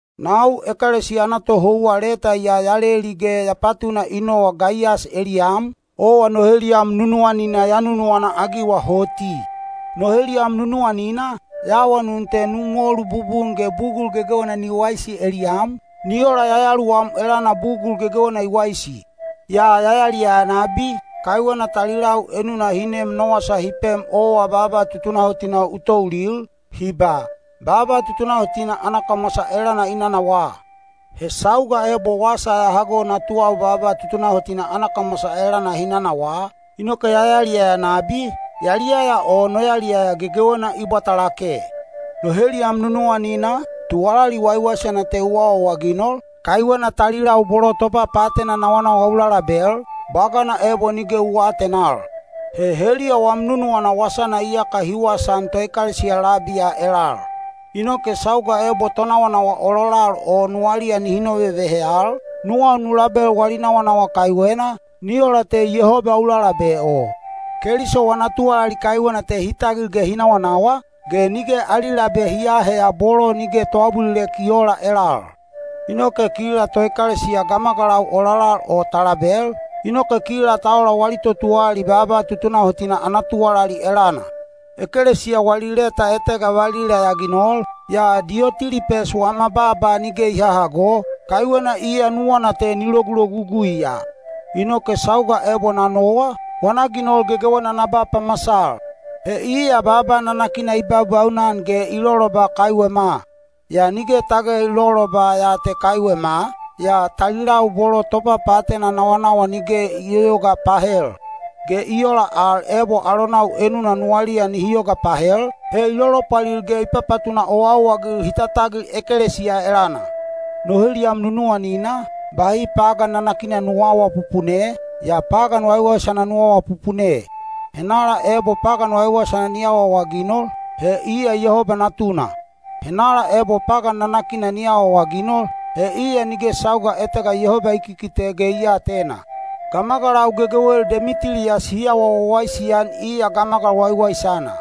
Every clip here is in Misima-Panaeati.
Nau ekelesiya ana tohouwa leta ya ya leli ge ya patuna i nowa Gaiyas eliyam, owa no heliyam nunuwanina ya nunuwana-agiwa hoti. No heliyam nunuwanina, ya awanun te nu molu bubun ge bugul gegewena ni waisi eliyam, ni ola yayaluwam elana bugul gegewena i waisi. Ya yaliyaya nabi, kaiwena talilau enuna hi nem no wasa hi pem owa baaba tutunahotina u toulil, hi ba, “Baaba tutunahotina ana kamwasa elana i nanawaa.” He sauga ebo wasa ya hago natuwau baaba tutunahotina ana kamwasa elana hi nanawaa, inoke ya yaliyaya nabi, yaliyaya o no yaliyaya gegewena i bwata lake. No heliyam nunuwanina, tuwalali waiwaisana te u awaawaginol, kaiwena talilau bolo topapaatena nawanawa u lalabel, bwagana ebo nige u aatenal. He heliya wam nunuwana wasana iyaka hi wasaan toekelesiya labi ya elal. Inoke sauga ebo tonawanawa ololal o nuwaliya nihi novevehe al, nuwau nu label wali nawanawa kaiwena, ni ola te Yehoba u lalabe o. Keliso wana tuwalali kaiwena te hi tagil ge hi nawanawa, ge nige ali labe hi aaheya bolo nige toabulilek i oola elal. Inoke kila toekelesiya gamagalau ololal o ta label, inoke kila ta ola wali totuwalali baaba tutunahotina ana tuwalali elana. Ekelesiya wali leta etega valila ya ginol, yaa Diyotilipes wama baaba nige i hahago, kaiwena iya nuwana te ni logulogugui ya. Inoke sauga ebo na nowa, wana ginol gegewena na ba pamasal. He iya baaba nanakina i baubaunan ge i loloba kaiwema. Yaa nige tage i loloba ya te kaiwema, yaa talilau bolo topapaatena nawanawa nige i yoyoga pahel. Ge i ola al ebo alonau enuna nuwaliya nihi yoga pahel, he i lolopwalil ge i papatuna owaowa-agil hi tatagil ekelesiya elana. No heliyam nunuwanina, bahi pagan nanakina nu aawapupune, yaa pagan waiwaisana nu awapupune. Henala ebo pagan waiwaisana ni awaawaginol, he iya Yehoba natuna. Henala ebo pagan nanakina ni awaawaginol, he iya nige sauga etega Yehoba i kikite ge i aatena. Gamagalau gegewel Demitiliyas hi awa wawaisi-an iya gamagal waiwaisana.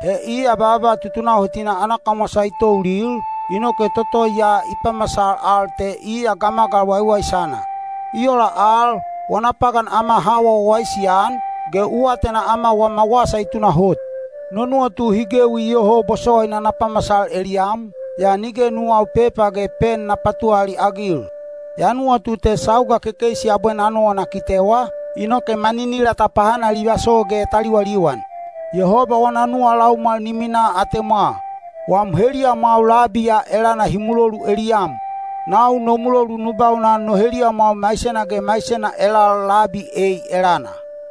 He iya baaba tutunahotina ana kamwasa i toulil, inoke toto ya i pamasal al te iya gamagal waiwaisana. I ola al, wana pagan ama ha awa wawaisi-an, ge u atena ama wama wasa i tunahot. No nuwatu hi gewi iyoho bosowaina na pamasal eliyam, yaa nige nuwau pepa ge pen na patuwalali-agil. Ya nuwatu te sauga kekeisi abwe na nowa na kitewa, inoke maninila ta pahanalivaso ge ta liwaliwan. Yehoba wana nuwa laumwal ni minaa atemwa. Wam heliyamwau labi ya elana hi mulolu eliyam. Nau no mulolu nu baunan no heliyamwau maisena ge maisena elal labi ei elana.